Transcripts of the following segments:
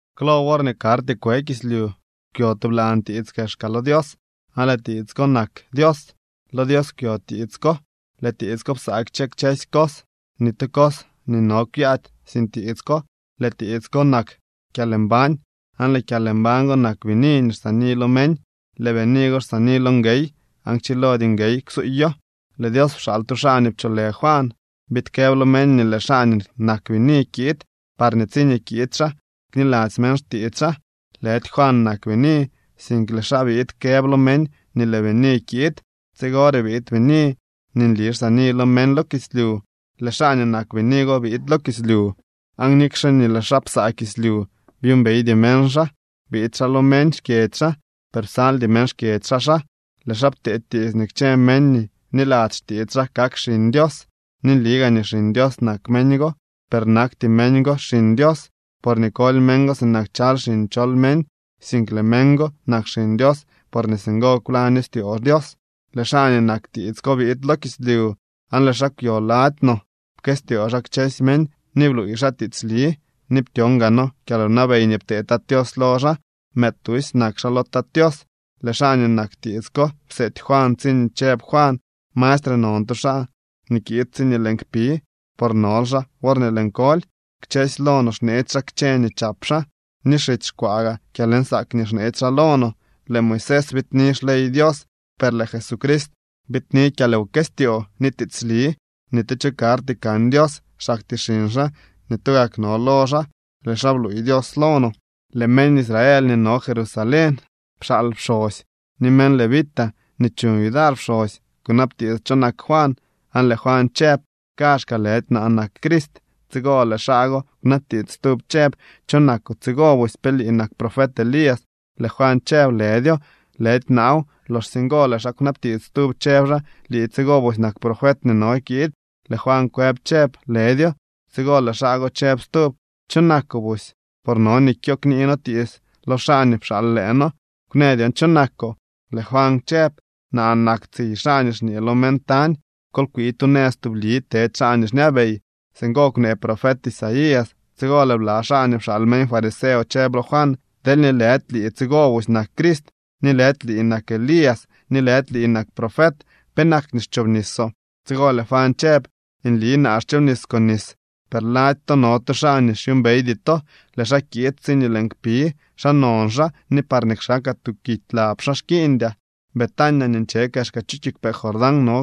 Klo worñee karty kwe kislyu kwyo tublan tiits kexka lo Dios aan lëë tiits ko nak Dios. Lo Dios kwyo tiits ko. Lëë tiits ko psaa kchë kchësy cos. Ni tu cos nii no kwyaady sin tiits ko. Lëë tiits ko nak kyalmbañ aan lëë kyalmbañ go nak bini nii xsaani lo meñ. Lëë bini go xsaani lo nguey aan kchilody nguey ksuuyo. Lëë Dios pxaal tu xaa nii pcholë Juan biid këb lo meñ nii lëë xaa nii nak bini kiid parñee tsiñee kiid xaa kniladzy meñ xtiits xaa. Lëdy Juan nak bini, sink lëë xaa biid këb lo meñ nii lëë bini kiid. Tsigore biid bini nii nli xsaani lo meñ lo kislyu. Lëë xaa nii nak bini go biid lo kislyu, aan nikxe nii lëë xaa psaa kislyu, byuumbeydy meñ xaa. Biid xaa lo meñ xkyedzy xaa, per psaldy meñ xkyedzy xaa xaa. Lëë xaa ptee tiits nii kchë meñ nii bniladzy xtiits xaa kak xiñ Dios. Ni nli gaa nii xiñ Dios nak meñ go, per nakty meñ go xiñ Dios porñee koly meñ go sinak chaly xiñ chol meñ, sink lëë meñ go nak xiñ Dios porñee singo kwlaño styoo Dios. Lëë xaa nii nak tiits ko biid lo kislyu aan lëë xaa kwyo lady no. Pkëstyoo xaa kchësy meñ ni bluuy xaa tiitsli, ni ptyon gaa noo kyalwnabey nii ptee Tat Tios lo xaa. Mëëd tusy nak xaa lo Tat Tios. Lëë xaa nii nak tiits ko pseety Juan tsiñee chëb Juan: —Mastre non tu xaa nii kiid tsiñee lëën kpi, por nol xaa worñee lëën koly. Kchësy lo no xneetsy xaa kchë nii chap xaa ni xitsy xkwaa gaa kyalnsaak nii xneetsy xaa lo no. Lëë Moisés biidni xley Dios, per lëë Jesucrist biidni kyalwkëstyoo ni tiitsli. Ni tu cho karty kan Dios, xaktyee xiñ xaa nii tugak no lo xaa. Lëë xaa bluuy Dios lo no. Lëë meñ Israel nii no Jerusalén pxaal pxosy ni meñ levita nii chuñ yudar pxosy kunabtiits cho nak Juan. Aan lëë Juan chëb: —Kaazhkaa lëdy naa nak Crist. Tsigo lëë xaa go kwnabtiits stub chëb: —¿Cho nakoo tsigo busy? ¿Pe lii nak profet Elías? Lëë Juan chëb: —Lëdyo, lëdy naaw. Loxsye ngo lëë xaa kwnabtiits stub chëb xaa: —¿Lii tsigo busy nak profet nii no kiid? Lëë Juan kwëb chëb: —Lëdyo. Tsigo lëë xaa go chëb stub: —¿Cho nakoo busy? Por no nii kyo knii noo tiits lo xaa nii pxaal lëë noo. Kwnë dyon cho nakoo. Lëë Juan chëb: —Naa nak tsiy xaa nii xñee lo meñ tañ: “Kol kwii tu nëz tubli tedy xaa nii xñabey.” Singo kwnee profet Isaías. Tsigo lëë bla xaa nii pxaal meñ fariseo chëb lo Juan: —Deelñee lëdy lii tsigo busy nak Crist ni lëdy lii nak Elías ni lëdy lii nak profet, ¿penak nii xchoobnisoo? Tsigo lëë Juan chëb: —Nli naa xchoobnis con nis, per lady to no tu xaa nii xyuumbeydy to. Lëë xaa kiid tsiñee lëën kpi. Xaa non xaa ni parñee kxakaa tuu kidy lab xaa xkiiñdyaa. Betania nii nche kexka chu kiigwpee Jordán no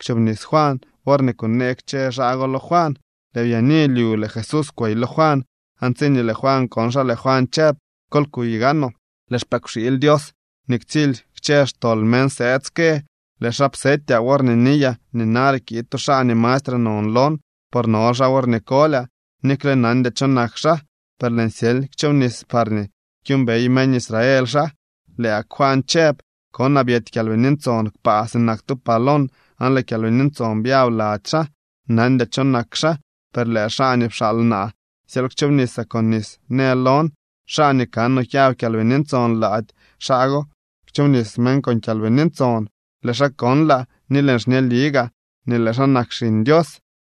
kchoobnis Juan worñee kunee kchë xaa go lo Juan. Lëë byaani lyu lëë Jesús kwey lo Juan aan tsiñee lëë Juan kon xaa, lëë Juan chëb: —Kol kuy gaanoo, lëë xpëkwxiily Dios nii ktsily kchë xtol meñ sëëd ske. Lëë xaa psetyaa worñee niyaa nii nare kiid tu xaa nii mastre non lon, por nol xaa worñee kolyaa. Nikle nandyaa cho nak xaa, per lëën syely kchoobnis parñee kyuumbey meñ Israel xaa. Lëë gak Juan chëb: —Konaa byety Kyalbini Ntson kpaa sinak tu palom aan lëë Kyalbini Ntson byab lady xaa. Nandyaa cho nak xaa, per lëë xaa nii pxaal naa syely kchoobnisaa con nis në lon: “Xaa nii kanoo kyab Kyalbini Ntson lady, xaa go kchoobnis meñ con Kyalbini Ntson.” Lëë xaa konlaa ni lëën xñeli gaa nii lëë xaa nak Xiñ Dios.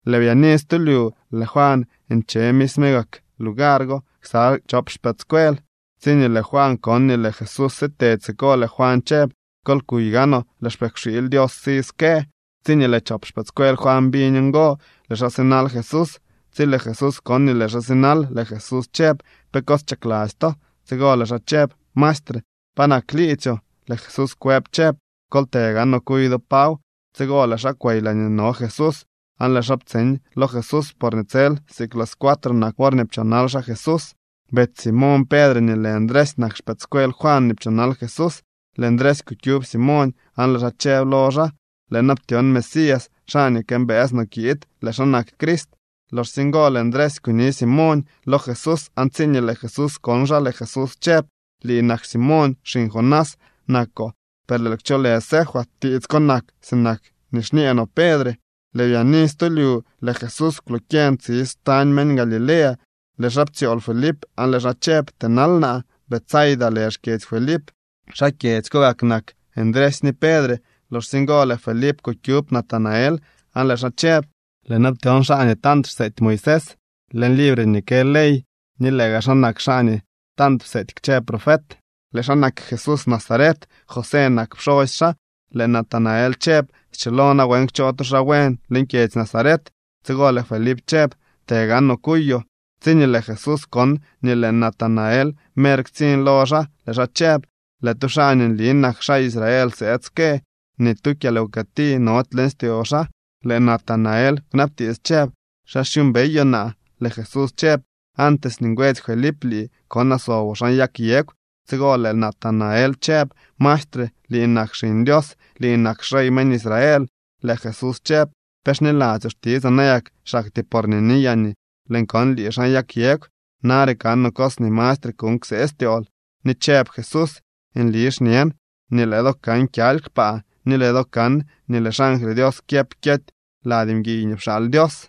Lëë byaani stu lyu lëë Juan nche misme gak lugar go ksa chop xpëëdscuel. Tsiñee lëë Juan kon nii lëë Jesús sitedy siko, lëë Juan chëb: —Kol kuy gaanoo, lëë xpëkwxiily Dios si ske. Tsiñee lëë chop xpëëdscuel Juan biñ ngo, lëë xaa sinal Jesús. Tsi lëë Jesús kon nii lëë xaa sinal, lëë Jesús chëb: —¿Pe cos chakladzy to? Tsigo lëë xaa chëb: —Maestre, ¿pa nak liidzyoo? Lëë Jesús kwëb chëb: —Kol të gaanoo kuy do paw. Tsigo lëë xaa kwey laañee no Jesús aan lëë xaa ptseñ lo Jesús porñee tsel siik las cuatro nak worñee pchoonal xaa Jesús. Betsy Simoñ Pedre nii lë Ndresy nak xpëëdscuel Juan nii pchoonal Jesús. Lëë Ndresy kukyub Simoñ aan lëë xaa chëb lo xaa: —Lëë noo ptyon Mesías, xaa nii këmbëës no kiid. Lëë xaa nak Crist. Loxsye ngo lëë Ndresy kuni Simoñ lo Jesús aan tsiñee lëë Jesús kon xaa, lëë Jesús chëb: —Lii nak Simoñ. Xiñ Jonás nakoo, per lëël kcholë Cefas. (Tiits ko nak sinak nii xñee no Pedre.) Lëë byaani stu lyu lëë Jesús kwlokyeñ tsi xtañ meñ Galilea. Lëë xaa ptsyool Felip aan lëë xaa chëb: —Tënal naa. Betsaida lë xkyedzy Felip. Xaa kyedzy ko gak nak Ndresy ni Pedre. Loxsye ngo lëë Felip kukyub Natanael aan lëë xaa chëb: —Lëë noo ptyon xaa nii tant xseety Moisés leñ libre nii kë ley ni lëë gaa xaa nak xaa nii tant pseety kchë profet. Lëë xaa nak Jesús Nazaret. José nak pxosy xaa. Lëë Natanael chëb: —¿Schilo nawen kchoo tu xaa buen leñ kyedzy Nazaret? Tsigo lëë Felip chëb: —Të gaanoo kuyoo. Tsiñee lëë Jesús kon nii lëë Natanael mer ktsiñ lo xaa lëë xaa chëb: —Lëë tu xaa nii nli nak xaa Israel sëëd ske. Ni tu kyalwkëti nody leñ styoo xaa. Lëë Natanael kwnabtiits chëb: —¿Xa xyuumbeyoo naa? Lëë Jesús chëb: —Antes nii ngwetsy Felip lii, konaa soboo xan yag yegw. Tsigo lëë Natanael chëb: —Maestre, lii nak Xiñ Dios. Lii nak xrey meñ Israel. Lëë Jesús chëb: —¿Pe xniladzyoo xtitsaa nayak xaktyee porñee niyaa nii lëën kon lii xan yag yegw? Nare kanoo cos nii mastre kuuñ ksee styool. Ni chëb Jesús: —Nli xñen nii lëë do kan kyaly kpaa ni lëë do kan nii lëë xangly Dios kyëp kyety lady mguiy nii pxaal Dios.